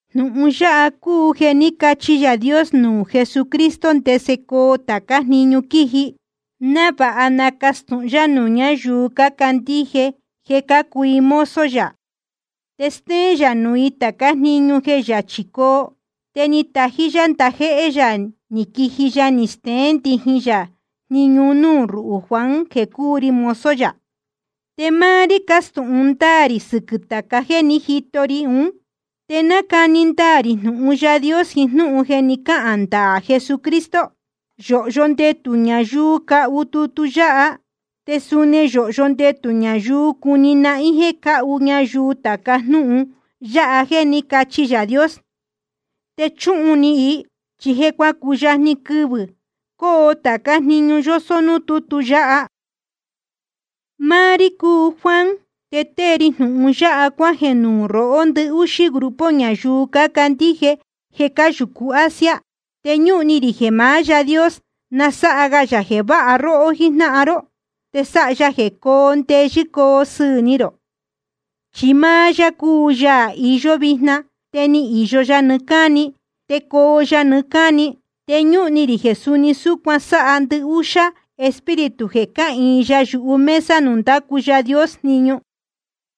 Jnūhun yáha cúu jeē ní cachi Yaā Dios nuū Jesucristo ndese coo tācá jniñu quiji, návāha nacastūhun yá nuū ñáyuu cácandíje jeē cácuu i mozo yā. Te stéén yā nuū i tācá jniñu jeē yachī coo. Te ni tají yá ndajéhé yā ni quiji ya ni steén ndijin yā jniñu un núū ruhū Juan jeē cúu ri mozo yā. Te máá rí cástūhun ndáā rī sɨquɨ̄ tāca jéē ní jito ri ún, te nácani ndaā rī jnūhun Yaā Dios jiín jnúhun jeē ní cahān ndaā Jesucristo. Yōhyo ndetū ñayuu cahu tutu yáha, te suni yōhyo ndetū ñayuu cuni nahín jeē cáhu ñayuu tāca jnúhun yáha jeē ní cachi Yaā Dios, te chuhun ni i. Chi je cuacuyajni quɨvɨ̄ coo tācá jniñu yósó núū tútu yáha. Máá rí cúu Juan, te tée ri jnūhun yáha cuájeē nuū rohó, ndɨhúxá grupo ñayuu cácandíje jeē cáyūcu Asia. Te ñúhun ni rī jeē maá Yaā Dios na sáha ga yā jeē váha róhó jíjnáhan ró, te sáha ya jeē coo ndeyɨ́ coo sɨɨ̄ ni rō. Chi máá yá cúu Yaā iyó vijna, te ni īyo ya nɨɨ́ cáni, te coo ya nɨɨ́ cáni. Te ñúhun ni rī jeē suni súcuan sáha ndɨhúxá Espíritu jeē cáhīin ya yuhu mesa nuū ndácu Yaā Dios jniñu.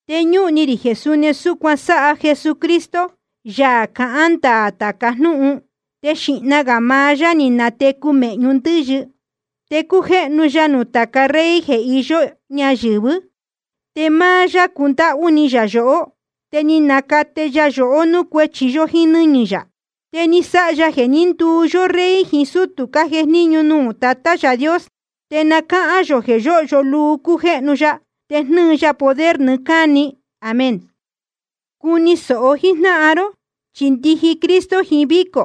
Te ñúhun ni rī jeē suni súcuan sáha Jesucristo, Yaā cahán ndaā tāca jnúhun. Te xīhna gā maá yá ni natecu mēhñu ndɨ́yɨ. Te cújéhnu ya nuū tāca rey jeē iyó ñayɨ̄vɨ́. Te máá yá cúndáhú ni yā yohó, te ni nacate ya yohó núū cuéchi yó jíín nɨ́ñɨ̄ yā. Te ni sáha ya jeē ní nduu yó rey jiín sútū cájejníñu nuū Tatá yā Yaā Dios. Te na cáhán yō jeē yóhyo luu cújéhnu ya te jnɨ́ɨ ya poder nɨɨ́ cáni. Amén. Cuni sōho jíjnáhan ró, chi ndiji Cristo jiín vícō.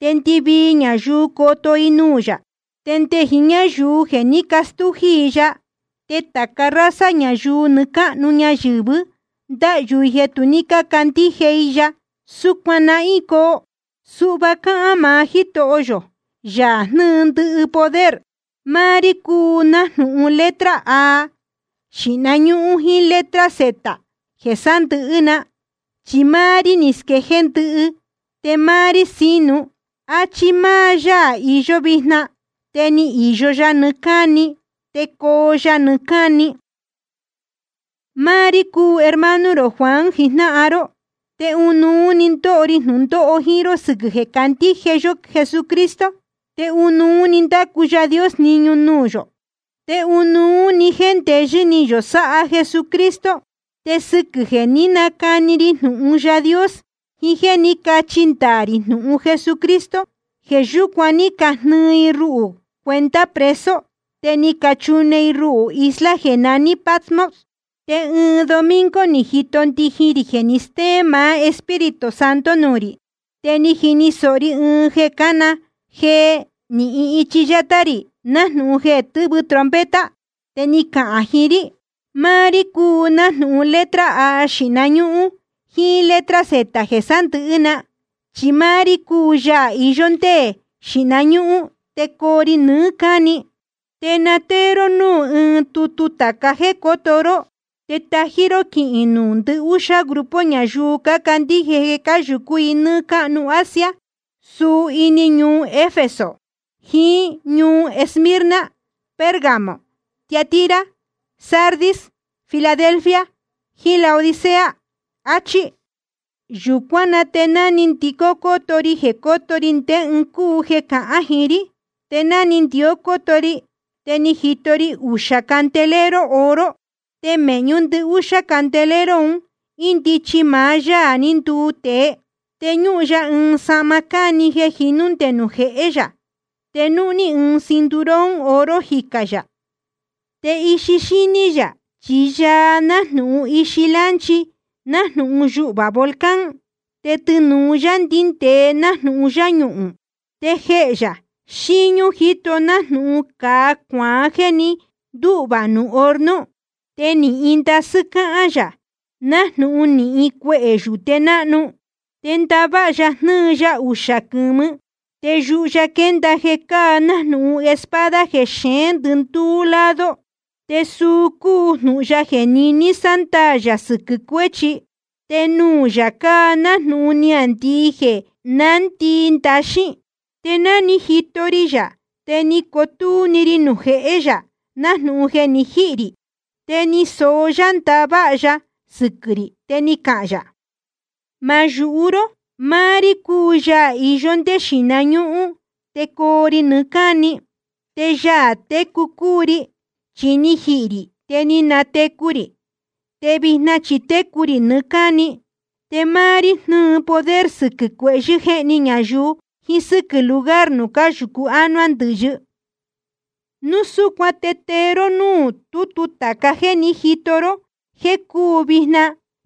Te ndɨvii ñayuu coto i nuū yā, te nde jiín ñáyuu jeē ní castújí i ya. Te tāca raza ñayuu nɨɨ́ cáhnu ñayɨ̄vɨ́ ndahyū i jeē tu ní cácandíje i ya. Súcuan nahín coo. Suhva cáhán maá Jítoho yō, Yaā jnɨ́ɨ ndɨhɨ poder: Máá rí cúu nájnūhun letra A xīhna ñúhún jíín letra Z jeē sándɨ̄hɨ́ na, chi máá rí ni squejéé ndɨhɨ te máá rí sínu, áchí máá Yaā iyó vijna, te ni īyo ya nɨɨ́ cáni, te coo ya nɨɨ́ cáni. Máá rí cúu hermano rō Juan jijnáhan ró. Te ɨnuú‑ni ndóho ri jnūndóho jíín ró sɨquɨ̄ jeē cácandíje yó Jesucristo, te ɨnuú‑ni ndácu Yaā Dios jniñu nuū yō, te ɨnuú‑ni jéndeyɨ́ ni yō sáha Jesucristo. Te sɨquɨ̄ jeē ní nacani ri jnūhun Yaā Dios jiín jéē ní cachi ndaā rī jnūhun Jesucristo, jeē yúcuan ní cajnɨɨ i ruhū cuenta preso, te ni cachune i ruhū isla jeē naní Patmos. Te ɨɨn domingo ni jito ndijin rī jeē ni stéén maá Espíritu Santo nuū rī. Te ni jini sōho ri ɨɨn jeē cána jee nīhin ichi yátá rī nájnūhun jeē tɨ́vɨ trompeta. Te ni cahān jiín rí: Máá rí cúu nájnūhun letra A xīhna ñúhún jíín letra Z jeē sándɨ̄hɨ́ na, chi máá rí cúu Yaā iyó ndé xīhna ñúhún te coo ri nɨɨ́ cáni. Te na tée ró núū ɨɨn tutu tāca jéē cóto ró, te tají ró quihīn nuū ndɨhúxá grupo ñayuu cácandíje jeē cáyūcú i nɨ́ɨ́ cáhnu Asia, suu ini ñuu Efeso, jiín ñuu Esmirna, Pérgamo, Tiatira, Sardis, Filadelfia, jiín Laodicea. Achí. Yūcuán na te ni ndicó cóto ri jeē cóto ri ndé ɨɨn cúu jeē cahán jiín rí. Te ná ni ndicó cóto ri te ni jito ri uxā candelero oro. Te mēhñú ndɨhúxá candelero un índichi maá Yaā ní nduu tēe. Te ñúhun ya ɨɨn sahma cáni jeē jinú nde nuū jehé yā. Te núhní ɨɨn cinturón oro jicā yā. Te ixi xíní yā chi yaa nájnūhun ixi lánchi, nájnūhun yuhvā volcán. Te tɨnūu ya ndíndēe nájnūhun yáñuhūn. Te jehē yā xíñú jíto nájnūhun cāa cuaán jéē ni ndúhvā nuū horno. Te nɨ́hɨn ndasɨ́ cáhán yā, nájnūhun nɨ́hɨn cuehē yūte náhnu. Te ndaváha ya jnɨ́ɨ ya uxā quɨ̄mɨ. Te yuhu ya quénda jeē cáa nájnūhun espada jeē xeén ndɨndúú lado, te suu cúu jnūhun ya jeē niní sándaā yā sɨquɨ̄ cuéchi. Te nuū yā cáa nájnūhun niāndii jeē nándii ndaxín. Te ná ni jito ri yā te ni cotúú rí nuū jéhē yā nájnūhun jeē ni jíhī rī. Te ni soó yá ndaváha ya sɨquɨ̄ rī, te ni cahān yā: Ma yūhu ró. Máá rí cúu Yaā iyó ndé xīhna ñúhún te coo ri nɨɨ́ cáni. Te Yaā técu cúu ri. Chi ni jihī rī te ni natecu rī, te vijna chi técu rī nɨɨ́ cáni. Te máá rí jnɨ́ɨ poder sɨquɨ̄ cuéhyɨ̄ jéhni ñayuu jiín sɨ́quɨ̄ lugar nuū cáyūcu ánuá ndɨ̄yɨ. Núu súcuan te tee ró núū tútu tāca jéē ní jito ró, jeē cúu vijna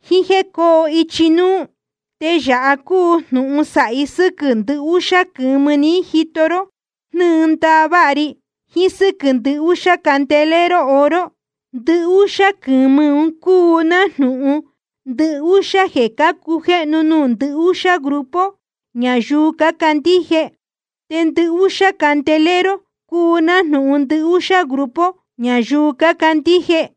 jíín jéē cóo ichi núú. Te yāha cúu jnūhun sāhi sɨ́quɨ̄ ndɨhúxá quɨ̄mɨ ni jito ró jnɨ́ɨ ndaváha ri, jiín sɨ́quɨ̄ ndɨhúxá candelero oro. Ndɨhúxá quɨ̄mɨ ún cúu nájnūhun ndɨhúxá jeē cácujéhnu nuū ndɨhúxá grupo ñayuu cácandíje. Te ndɨhúxá candelero cúu nájnūhun ndɨhúxá grupo ñayuu cácandíje.